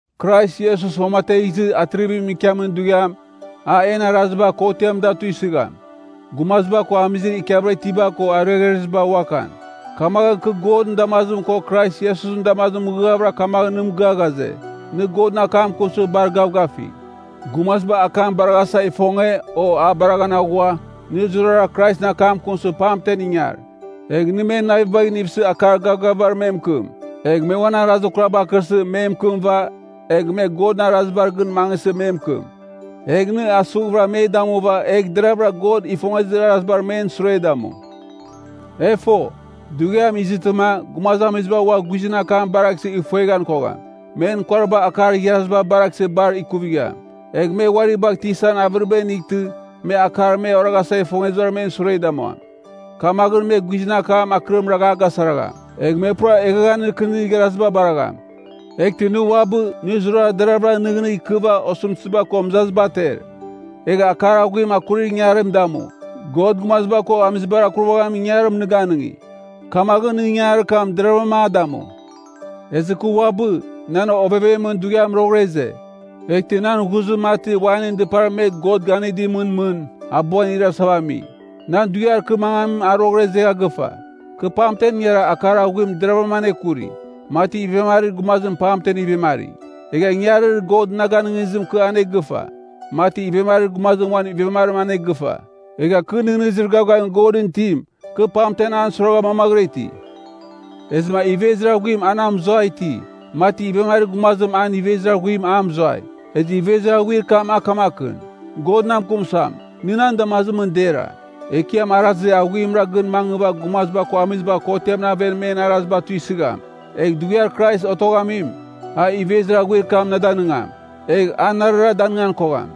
Krais Iesus uamategh izɨ atrivimɨn ikiamin dughiam, a en araziba kotiamɨn da tuisɨgham, gumaziba ko amizir ikiavɨra itiba ko ariaghreziba uakan. Kamaghɨn kɨ Godɨn damazim ko Krais Iesusɨn damazimɨn mɨghɨghavɨra kamaghɨn nɨ mɨgɨa ghaze, nɨ Godɨn akam akunsɨ bar gavgafigh. Gumaziba akam baraghasa ifonge, o a baraghan aghua, nɨ zurara Kraisɨn akam akunsɨ pamtem ingar. Egh nɨ men navibagh inivsɨ akar gavgavibar me mɨkɨm, egh me uan arazir kuraba akɨrsɨ me mɨkɨmɨva, egh me Godɨn arazibar gɨn mangɨsɨ me mɨkɨm. Egh nɨ asughvɨra me damuva egh deravɨra God ifongezir arazibar men sure damu. E fo, dughiam izɨtɨma, gumazamiziba ua guizɨn akam baraghsɨ ifueghan kogham. Men kuariba akar igharaziba baraghsɨ bar ikuvigham. Egh me uari bagh tisan avɨriba inightɨ, me akar me oraghasa ifongezibar men sure damuam. Kamaghɨn me guizɨn akam akɨrim ragh a gasaragham. Egh me pura eghaghanir kɨnir igharaziba baragham. Eghtɨ nɨ uabɨ, nɨ zurara deravɨra nɨghnɨgh ikɨva osɨmtɨziba ko mɨzaziba ater. Egh akar aghuim akurir ingangarim damu. God gumaziba ko amizibar akurvaghamin ingangarim nɨ ganɨngi. Kamaghɨn nɨ ingangarir kam deravɨram a damu. Ezɨ kɨ uabɨ, nan ovevemɨn dughiam roghɨra ize. Eghtɨ nan ghuzim mati wainɨn dɨpar me God ganɨdimɨn mɨn, abuan irasava ami. Nan dughiar kɨ mangamim a roghɨra izegha gɨfa. Kɨ pamtem ingara akar aghuim deravɨram anekuri, mati ivemarir gumazim pamtem ivemari. Egha ingangarir God na ganɨngizim kɨ anegɨfa, mati ivemarir gumazim uan ivemarim anegɨfa. Egha kɨ nɨghnɨzir gavgavir Godɨn itim, kɨ pamtem an suiragha mamaghɨra iti. Ezɨma ivezir aghuim a na mɨzuai iti, mati ivemarir gumazim an ivezir aghuim a mɨzuai. Ezɨ ivezir aghuir kam a kamakɨn, God na mɨkɨm suam, nɨ nan damazimɨn dera. Ekiam arazir aghuimra gɨn mangɨva gumaziba ko amiziba kotiamɨn aven men araziba tuisɨgham. Egh Dughiar Krais Otoghamim, a ivezir aghuir kam na danɨngam. Egh a narara danɨngan kogham.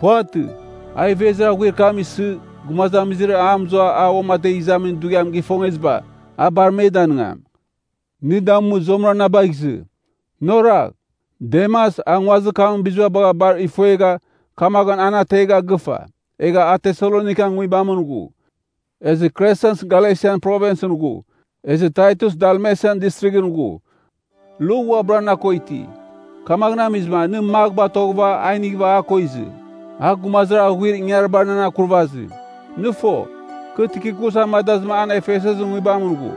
Puvatɨ. A ivezir aghuir kam isɨ, gumazamizir a mɨzua a uamategh izamin dughiam gifongeziba, a bar me danɨngam. Nɨ damu, zuamɨra na bagh izɨ. Nɨ oragh! Demas, a nguazir kamɨn biziba bagha bar ifuegha, kamaghɨn a na ategha gɨfa, egha a Tesalonikan nguibamɨn ghu. Ezɨ Kresens Galesian Provinsɨn ghu, ezɨ Taitus Dalmesian Distrighɨn ghu. Luk uabɨra na ko iti. Kamaghɨn amizɨma nɨ Mak batoghɨva a inighɨva a ko izɨ. A gumazir aghuir ingangaribar nan akurvazim. Nɨ fo, kɨ Tikikus amadazɨma an Efesesɨn nguibamɨn ghu.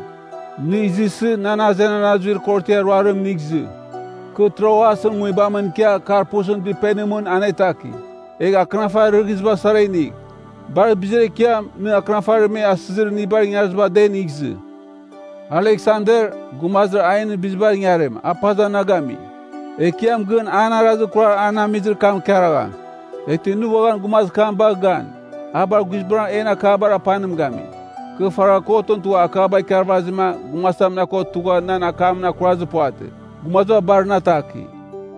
Nɨ izɨsɨ, nan azenan azuir korotiar ruarim inigh izɨ. Kɨ Troasɨn nguibamɨn ikia Karpusɨn dɨpenimɨn anetaki. Egh akɨnafarir rɨghiziba sara inigh. Bar bizir ekiam, nɨ akɨnafarir me asɨzir inibar ingariziba da inigh izɨ. Aleksander, gumazir ainɨn bizibar ingarim, a bar paza na gami. Ekiam gɨn an arazir kurar an amizir kam ikaragham. Eghtɨ nɨ uaghan gumazir kam bagh gan. A bar guizbangɨra en akabar apanim gami. Kɨ faragha Kotɨn tugha akaba ikarvazima gumazitam na ko tugha nan akamɨn akurazir puvatɨ. Gumaziba bar na ataki.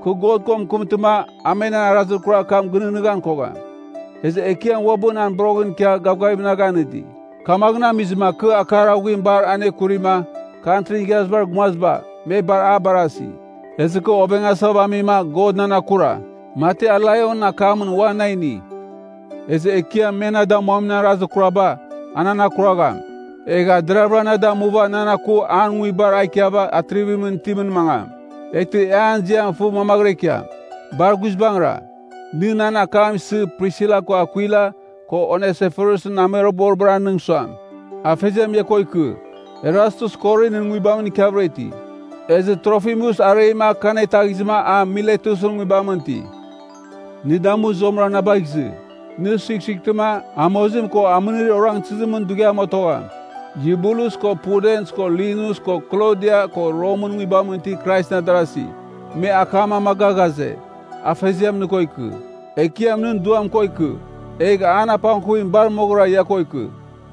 Kɨ God ko mɨkɨmtɨma, a men arazir kurar kam gɨnɨghnɨghan kogham. Ezɨ Ekiam uabɨ nan boroghɨn ikia gavgavim na ganɨdi. Kamaghɨn amizɨma kɨ akar aghuim bar anekurima, Kantrin Igharazibar Gumaziba, me bar a barasi. Ezɨ kɨ ovengasava amima God nan akura, mati a laionɨn akamɨn ua na ini. Ezɨ Ekiam me na damuamin arazir kuraba, a nan akuragham. Egh a deravɨra na damuva nan aku uan Nguibar a ikiava atrivimɨn itimɨn mangam. Eghtɨ e an ziam fɨ mamaghɨra ikiam. Bar guizbangɨra. Nɨ nan akam isɨ, Prisila ko Akwila, ko Onesiforusɨn amuiroghboribar anɨng suam, Afeziam ia ko ikɨ. Erastus Korinɨn nguibamɨn ikiavɨra iti. Ezɨ Trofimus areima kɨ anetaghizɨma a Miletusɨn nguibamɨn iti. Nɨ damu, zuamɨra na bagh izɨ. Nɨ suighsuightɨma, amozim ko amɨnir orangtɨzimɨn dughiam otogham. Yubulus ko Pudens ko Linus ko Klodia ko Romɨn nguibamɨn itir Kraisɨn adarasi, me akam amaga ghaze, Afeziam nɨ ko ikɨ. Ekiam nɨn duam ko ikɨ. Egh an apangkuvim bar moghɨra ia ko ikɨ.